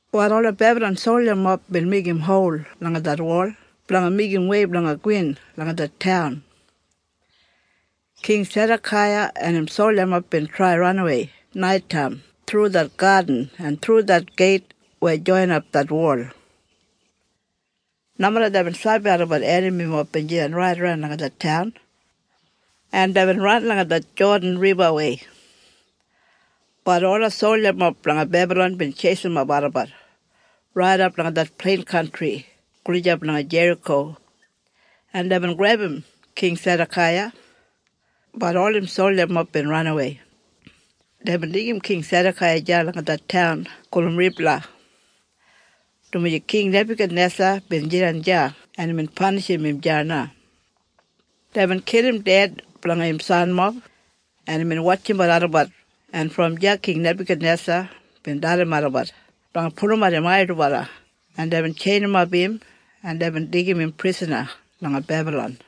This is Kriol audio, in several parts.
Wal ola Bebalon soljamob bin meigim hol langa det wol blanga meigim wei blanga gowin langa det taun. King Sedakaiya en im soljamob bin trai ranawei nait taim thru det gadin en thru det geit weya joinap det wol. Nomeda deibin sabi olabat enamimob bin jidan raidaran langa det taun. En deibin ran langa det Jodan Ribawei. Bat ola soljamob blanga Bebalon bin tjeisimap olabat raidap langa det plein kantri gulijap langa Jeriko, en deibin grebum King Sedakaiya, bat ol im soljamob bin ranawei. Deibin deigim King Sedakaiya deya langa det taun gulum Ribla, dumaji King Nebakanesa bin jidan deya en imbin panishim im deya na. Deibin kilim ded blanga im sanmob en imbin wotjimbat olabat en brom deya King Nebakednesa bin dalim olabat blanga pulumat im ai dubala en deibin tjeinimap im en deibin deigim im prisana langa Bebalon.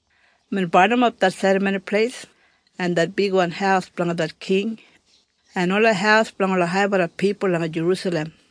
Imbin barnimap det Serramoni Pleis en det bigwan haus blanga det king en ola haus blanga ola haibala pipul langa Jerusalem.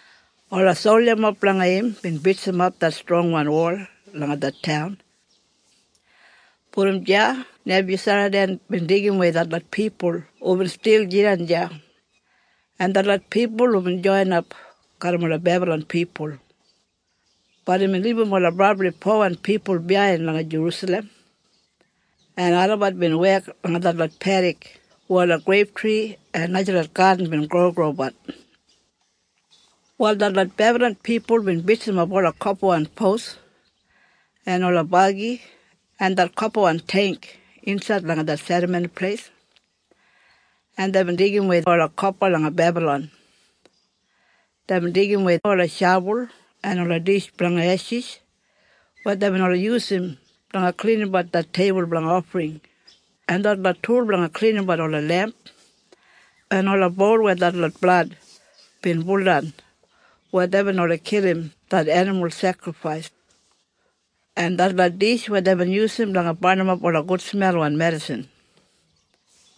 Ola soljamob blanga im bin bitsimap det strongwan wol langa det taun. Brom deya Nebusaradan bin deigimwei detlot pipul hubin stil jidan deya, en detlot pipul hubin joinap garram ola Bebalon pipul. Bat imbin libum ola brabli powan pipul biyain langa Jerusalem. En olabat bin wek langa detlot pedik weya ola greiptri en najalot gadin bin grogrobat. Wal detlot Bebalon pipul bin bitsimap ola kopawan pos en ola bagi en det kopawan teingk insaid langa det Serramoni Pleis. En deibin deigimwei ola kopa langa Bebalon. Deibin deigimwei ola shabul en ola dish blanga eshis weya deibin oldei yusum blanga klinimbat det teibul blanga ofring, en detlot tul blanga klinimbat ola lemp, en ola boul weya detlot blad bin buldan wen deibin oldei kilim det enimul sekrifais, en detlot dish weya deibin yusum blanga barnimap ola gudsmelwan medisin,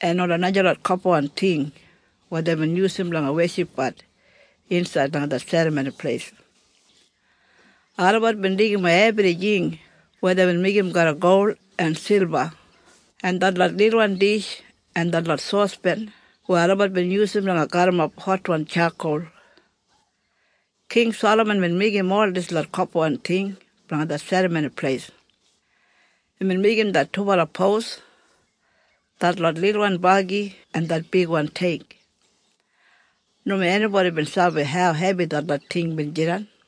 en ola najalot kopawan ting weya deibin yusum blanga weshipbat insaid langa det Serramoni Pleis. Olabat bin deigimwei ebrijing weya deibin meigim garram gol en silba en detlot lilwan dish en detlot sospen weya olabat bin yusum blanga garrimap hotwan tjakol. King Salaman bin meigim ol dislot kopawan ting blanga det Serramoni Pleis. Imbin meigim det dubala pos, detlot lilwan bagi en det bigwan teingk. Nomo enibodi bin sabi hau hebi detlot ting bin jidan.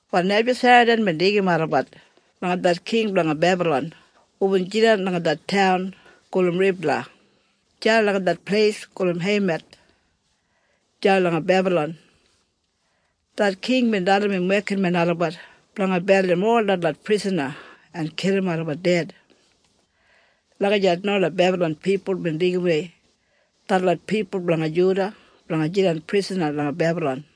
Wal Nebusaradan bin deigim olabat langa det king blanga Bebalon hubin jidan langa det taun gulum Ribla, deya langa det pleis gulum Heimath, deya langa Bebalon. Det king bin dalim im wekinmen olabat blanga beldim ol detlot prisana en kilim olabat ded. Lagijat na ola Bebalon pipul bin deigimwei detlot pipul blanga Juda blanga jidan prisana langa Bebalon.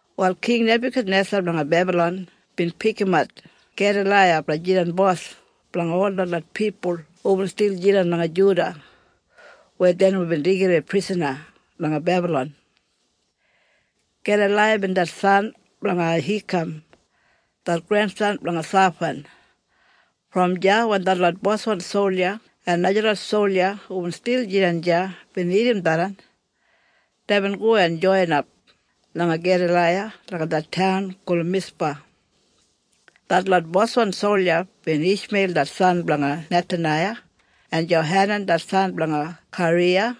Wal King Nebakanesa blanga Bebalon bin pikimat Gedalaiya blanga jidan bos blanga ol detlot pipul hubin stil jidan langa Juda weya dei nomo bin deigidawei prisana langa Bebalon. Gedalaiya bin det san blanga Ahikam det grensan blanga Shafan. Brom deya wen detlot boswan solja en najalot solja hubin stil jidan deya bin irrim tharran, deibin go en joinap langa Gedalaiya langa det taun gulum Mispa. Detlot boswan solja bin Ishmeil det san blanga Nethanaiya, en Johanan det san blanga Kariya,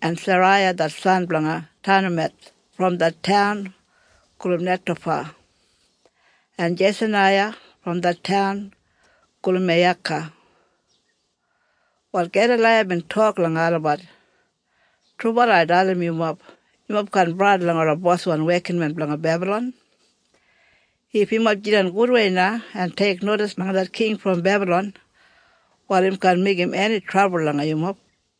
en Seraiya det san blanga Tanumeth brom det taun gulum Netofa en Jesanaiya brom det taun gulum Meiyaka. Wal Gedalaiya bin tok langa olabat, “Trubala ai dalim yumob, yumob kaan bradin langa ola boswan wekinmen blanga Bebalon. If yumob jidan gudwei na en teiknodis langa det king brom Bebalon, wal im kaan meigim eni trabul langa yumob.”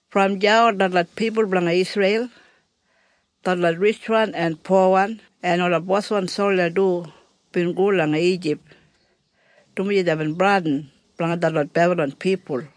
Brom deya ol detlot pipul blanga Isreil, detlot ritjwan en powan en ola boswan solja du bin go langa Ijip, dumaji deibin bradin blanga detlot Bebalon pipul.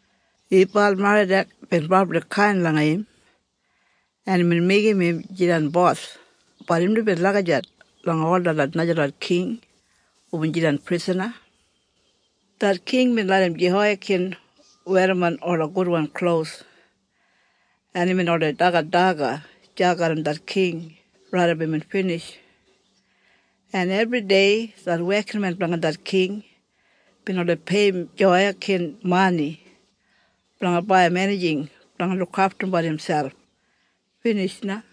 Ibalmeradak bin brabli kain langa im en imbin meigim im jidan bos bat im nomo lagijat langa ol detlot najalot king hubin jidan prisana. Det king bin larram Jehoiyakin werrimon ola gudwan klos, en imbin oldei dagat daga deya garram det king raidap imbin binij. En ebridei det wekinmen blanga det king bin oldei peiyim Jehoiyakin mani blanga baiyim enijing blanga lukaftum miselp. Binij na.